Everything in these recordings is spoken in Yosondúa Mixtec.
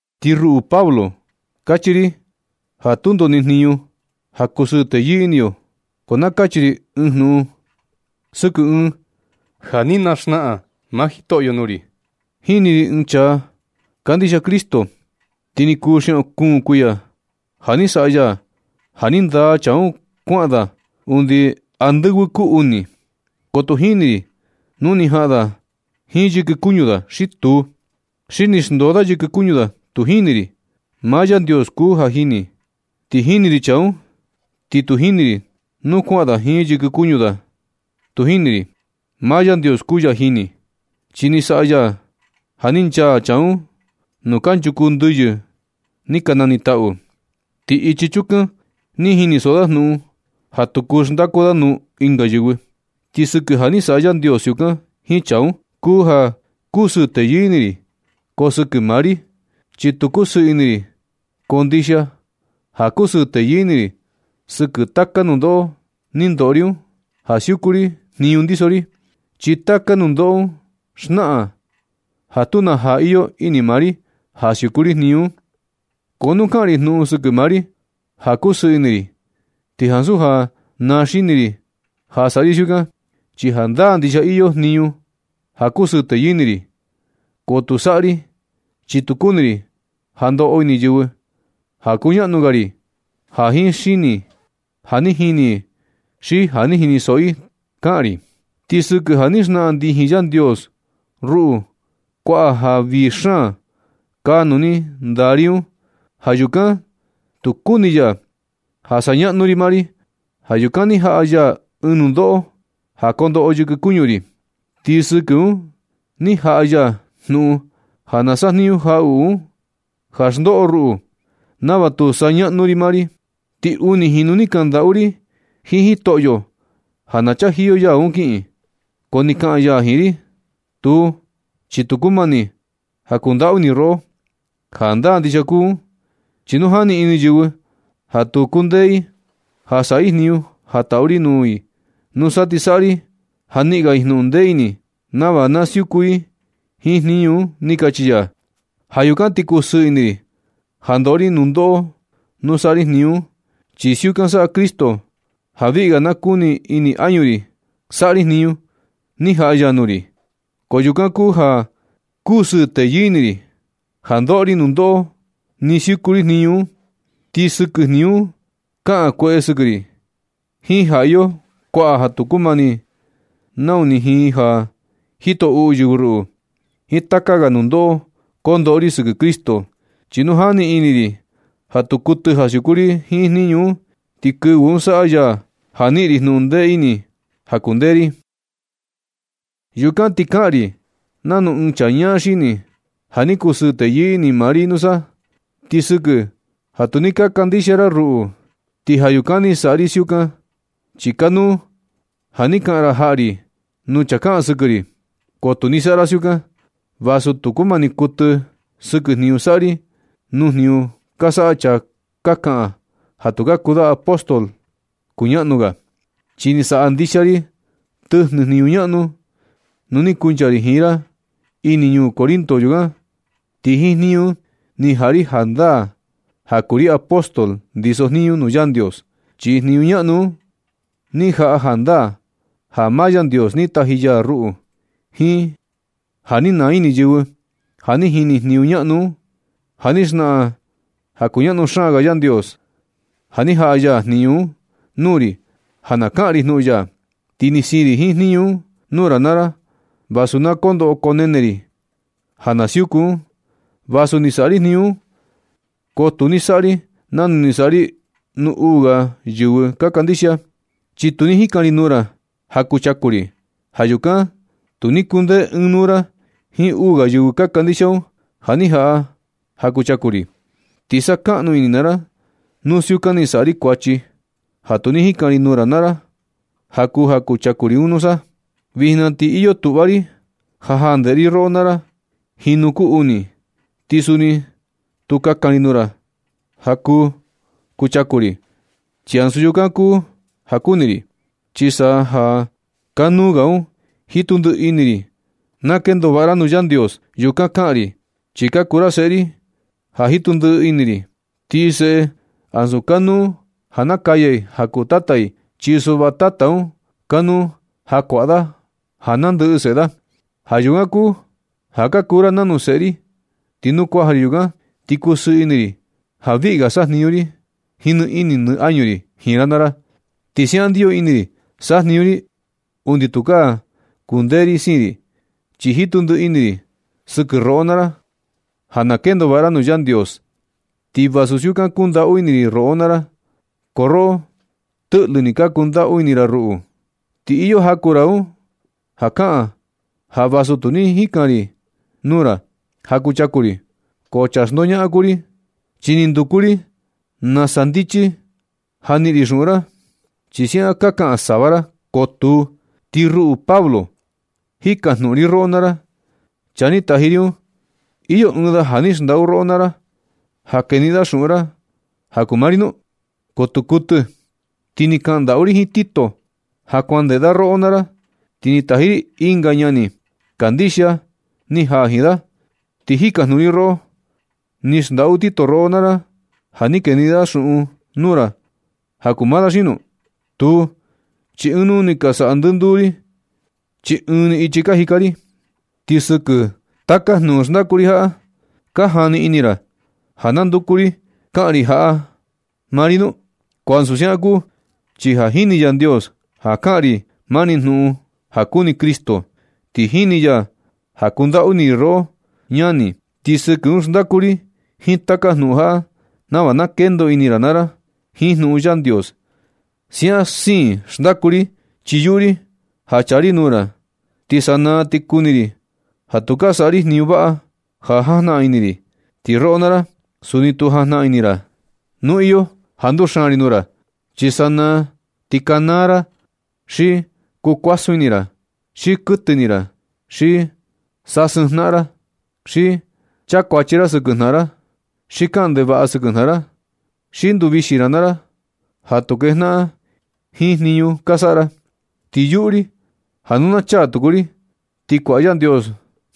Ti ruꞌu Pablo, kachi ri ja tundo ni jniñu ja kusɨɨ teyɨɨ ini yo, ko na kachi ri ɨɨn jnuꞌun sɨkɨ ɨɨn ja ni naxnaꞌan maa Jitoꞌyo nuu ri. Jini ri ɨɨn chaa kandixia Cristo, ti ni kuu xiaꞌun kuun kuiya ja ni saꞌa ya ja ni ndaa chaa un kuaꞌan da undi andɨvɨ kuu uni. Ko tu jini ri nu ni jaꞌan da jiin yɨkɨ kuñu da xi tuu, xi ni xndoo da yɨkɨ kuñu da, tu jini ri. Maa Yandios kuu ja jini. Ti jini ri chaa un, ti tu jini ri nu kuaꞌan da jiin yɨkɨ kuñu da, tu jini ri. Maa Yandios kuu ya jini. Chi ni saꞌa ya ja ni nchaa chaa un nuu kanchuku ndɨyɨ ni ka nanitaꞌu. Ti ichi chukan ni jinisoꞌo da jnuꞌun ja tu kuu xndaku da nuu ɨnga yɨvɨ. Ti sɨkɨ ja ni saꞌa Yandios siukan jiin chaa un, kuu ja kusɨɨ teyɨɨ ini ri, ko sɨkɨ maa ri, chi tu kusɨɨ ini ri. Ko ndixia ja kusɨɨ teyɨɨ ini ri sɨkɨ taka nundoꞌo ni ndoꞌo ri un ja siuku ri jniñu ndiso ri, chi taka nundoꞌo un xnaꞌan ja tu na jaa iyo ini maa ri ja siuku ri jniñu un. Ko nu kaꞌan ri jnuꞌun sɨkɨ maa ri ja kusɨɨ ini ri, ti ansu ja naa xini ri ja saꞌa ri siukan, chi jandaa ndixia iyo jniñu ri ja kusɨɨ teyɨɨ ini ri. Ko tu saꞌa ri, chi tu kuni ri ja kondoꞌo ini yɨvɨ ja kuñaꞌnu ga ri ja ni jini i xi ja ni jinisoꞌo i kaꞌan ri. Ti sɨkɨ ja ni xnaꞌan ndijin Yandios ruꞌu kuaꞌa ja vii xaan kaa nuu ni ndaa ri un. Ja yukan tu kuni ya ja saꞌa ñaꞌnu ri maa ri. Ja yukan ni jaꞌa ya ɨɨn nundoꞌo ja kondoꞌo yɨkɨ kuñu ri. Ti sɨkɨ un ni jaꞌa ya jnuꞌun ja na sajniñu jaꞌuꞌu un, ja xndoꞌo ruꞌu nava tu saꞌa ñaꞌnu ri maa ri. Ti uni jinu ni kaꞌan ndaꞌu ri jiin Jitoꞌyo ja na chajiyo ya un kiꞌin. Ko ni kaꞌan ya jiin ri: “Tuu, chi tu kumani ja kundaꞌu ini ri roꞌo. Jandaa ndixia kuu un, chi nu jani ini yɨvɨ ja tu kundee i ja saꞌa i jniñu, ja taꞌu ri nuu i. Nusa ti saꞌa ri ja niꞌin ga i jnuꞌun ndee ini i nava na siuku i jiin jniñu un”, ni kachi ya. Ja yukan ti kusɨɨ ini ri ja ndoꞌo ri nundoꞌo nu saꞌa ri jniñu un, chi siukan saꞌa Cristo ja viꞌi ga na kuni ini añu ri saꞌa ri jniñu ni jaꞌa ya nuu ri. Ja yukan kuu ja kusɨɨ teyɨɨ ini ri ja ndoꞌo ri nundoꞌo nɨ siuku ri jniñu un. Ti sɨkɨ jniñu un kaꞌan kueꞌe i sɨkɨ ri, jiin ja iyo kuaꞌa ja tu kumani, nau ni jiin ja jito uꞌu yɨvɨ ruꞌu, jiin taka ga nundoꞌo kondoꞌo ri sɨkɨ Cristo. Chi nu jani ini ri ja tu kuɨtɨ ja siuku ri jiin jniñu un, ti kɨvɨ un saꞌa ya ja niꞌin ri jnuꞌun ndee ini ja kundee ri. Yukan ti kaꞌan ri nanu ɨɨn chaa ñaa xini ja ni kusɨɨ teyɨɨ ini maa ri nusa. Ti sɨkɨ ja tu ni ka kandixia ra ruꞌu, ti ja yukan ni saꞌa ri siukan. Chi kanuu ja ni kaꞌan ra jaꞌa ri nuu chaa kaꞌan sɨkɨ ri, ko tu ni saꞌa ra siukan, vasu tu kumani kuɨtɨ sɨkɨ jniñu saꞌa ri nuu jniñu ka saꞌa chaa ka kaꞌan ja ka kuu da apóstol kuñaꞌnu ga. Chi ni saꞌa ndixia ri tɨjnɨ jniñu ñaꞌnu nu ni kuncha ri jiin ra ini ñuu Corinto yukan, ti jiin jniñu un ni jaꞌa ri jandaa ja kuu ri apóstol ndiso jniñu nuu Yandios. Chi jniñu ñaꞌnu un ni jaꞌa jandaa ja maa Yandios ni taji ya ruꞌu, jiin ja ni naa ini yɨvɨ ja ni jini jniñu ñaꞌnu un, jiin ja xnaꞌan ja kuñaꞌnu xaan ga Yandios, ja ni jaꞌa ya jniñu un nuu ri ja na kaꞌan ri jnuꞌun ya. Ti ni siin ri jiin jniñu un nuu ra naa ra vasu na koo ndoꞌo koo nene ri ja na siuku un. Vasu ni saꞌa ri jniñu un, ko tu ni saꞌa ri nanu ni saꞌa ri nuu uu ga yɨvɨ ka kandixia, chi tu ni jikan ri nuu ra ja kuchaku ri. Ja yukan tu ni kundee ɨɨn nuu ra jiin uu ga yɨvɨ ka kandixia un ja ni jaꞌa ja kuchaku ri. Ti sakaꞌnu ini naa ra nu siukan ni saꞌa ri kuachi, ja tu ni jikan ri nuu ra naa ra ja kuu ja kuchaku ri un nusa. Vijna ti iyo tuꞌva ri ja jaa ndeꞌe ri roꞌo naa ra jinu kuu uni. Ti suni tu kakan ri nuu ra ja kuu kuchaku ri, chi ansu yukan kuu ja kuni ri, chi sa ja kanuu ga un jitu ndiꞌi ini ri na kendo vaꞌa ra nuu Yandios. Yukan kaꞌan ri, chi ka kuu ra seꞌe ri ja jitu ndiꞌi ini ri, ti seꞌe ansu kanuu ja nakaya i ja kuu tata i. Chi suꞌva tata un kanuu ja kuaꞌa da ja nandɨꞌɨ seꞌe da. Ja yukan kuu ja ka kuu ra nanu seꞌe ri, ti nu kuaja ri yukan, ti kusɨɨ ini ri ja viꞌi ga sajniñu ri jiin nɨ ini nɨ añu ri jiin ra naa ra. Ti siaꞌan ndiyo ini ri sajniñu ri undi tukaa kundee ri siin ri, chi jitu ndiꞌi ini ri sɨkɨ roꞌo naa ra ja na kendo vaꞌa ra nuu Yandios. Ti vasu siukan kundaꞌu ini ri roꞌo naa ra, ko roꞌo tɨꞌlɨ ni ka kundaꞌu ini ra ruꞌu. Ti iyo jaku ra un ja kaꞌan ja vasu tu ni jikan ri nuu ra ja kuu kuchaku ri, ko chaa xndoñaꞌan kuu ri, chi ni nduku ri nasa ndichi ja niꞌin ri xuꞌun ra, chi siaꞌan ka kaꞌan sava ra. Ko tuu. Ti ruꞌu Pablo, jikajnuꞌun ri roꞌo naa ra, chaa ni taji ri un, iyo ɨɨn da ja ni xndaꞌu roꞌo naa ra ja keniꞌin da xuꞌun ra ja kuu maa ri nu? Ko tu kuɨtɨ. Ti ni kaꞌan ndaꞌu ri jiin Tito ja kuan ndeꞌe da roꞌo naa ra, ti ni taji ri ɨnga ñani kandixia ni jaa jiin da. Ti jikajnuꞌun ri roꞌo, ¿ni xndaꞌu Tito roꞌo naa ra ja ni keniꞌin da xuꞌun nuu ra ja kuu maa da xi nau? Tuu, chi ɨɨn nuu ni ka saꞌa ndɨnduu ri, chi ɨɨn ni ichi ka jika ri. ¿Ti sɨkɨ taka jnuꞌun xndaku ri jaꞌa, ka jani ini ra ja na nduku ri kaꞌan ri jaꞌa maa ri nu? Ko ansu siukan kuu, chi ja jini Yandios ja kaꞌan ri mani jnuꞌun ja kuni Cristo. Ti jini ya ja kundaꞌu ini ri roꞌo, ñani. Ti sɨkɨ un xndaku ri jiin taka jnuꞌun jaꞌa nava na kendoꞌo ini ra naa ra jiin jnuꞌun Yandios. Siaꞌan siin xndaku ri, chi yuꞌu ri ja chaa ri nuu ra, ti sanaa ti kuni ri ja tu ka saꞌa ri jniñu vaꞌa ja jajnaꞌan ini ri. Ti roꞌo naa ra, suni tu jajnaꞌan ini ra nu iyo ja nduxaan ri nuu ra. Chi sanaa ti kanaa ra, xi kukuasun ini ra, xi kuɨtɨ ini ra, xi sasɨɨn jnaꞌan ra, xi chakuachi ra sɨkɨ jnaꞌan ra, xi kaꞌan ndevaꞌa sɨkɨ jnaꞌan ra, xi nduvixi ra maa ra ja tu kejnaꞌan jiin jniñu ka saꞌa ra. Ti yuꞌu ri ja nu na chaa tuku ri, ti kuaꞌa Yandios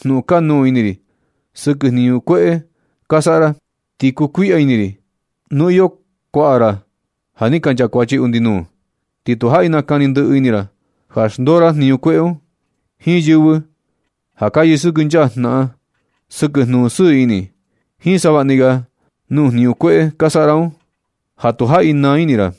jnuꞌun kanuū ini ri sɨkɨ jniñu kueꞌe ka saꞌa ra. Ti kukuiꞌya ini ri nu iyo kuaꞌa ra ja ni ka nchakuachi undi nuu, ti tu jaꞌi nakani ndɨꞌɨ ini ra ja xndoo ra jniñu kueꞌe un, jiin yɨvɨ ja ka yɨsɨkɨnchaa jnaꞌan sɨkɨ jnuꞌun sɨɨ ini, jiin savaꞌni ga nuu jniñu kueꞌe ka saꞌa ra un, ja tu jaꞌi naa ini ra.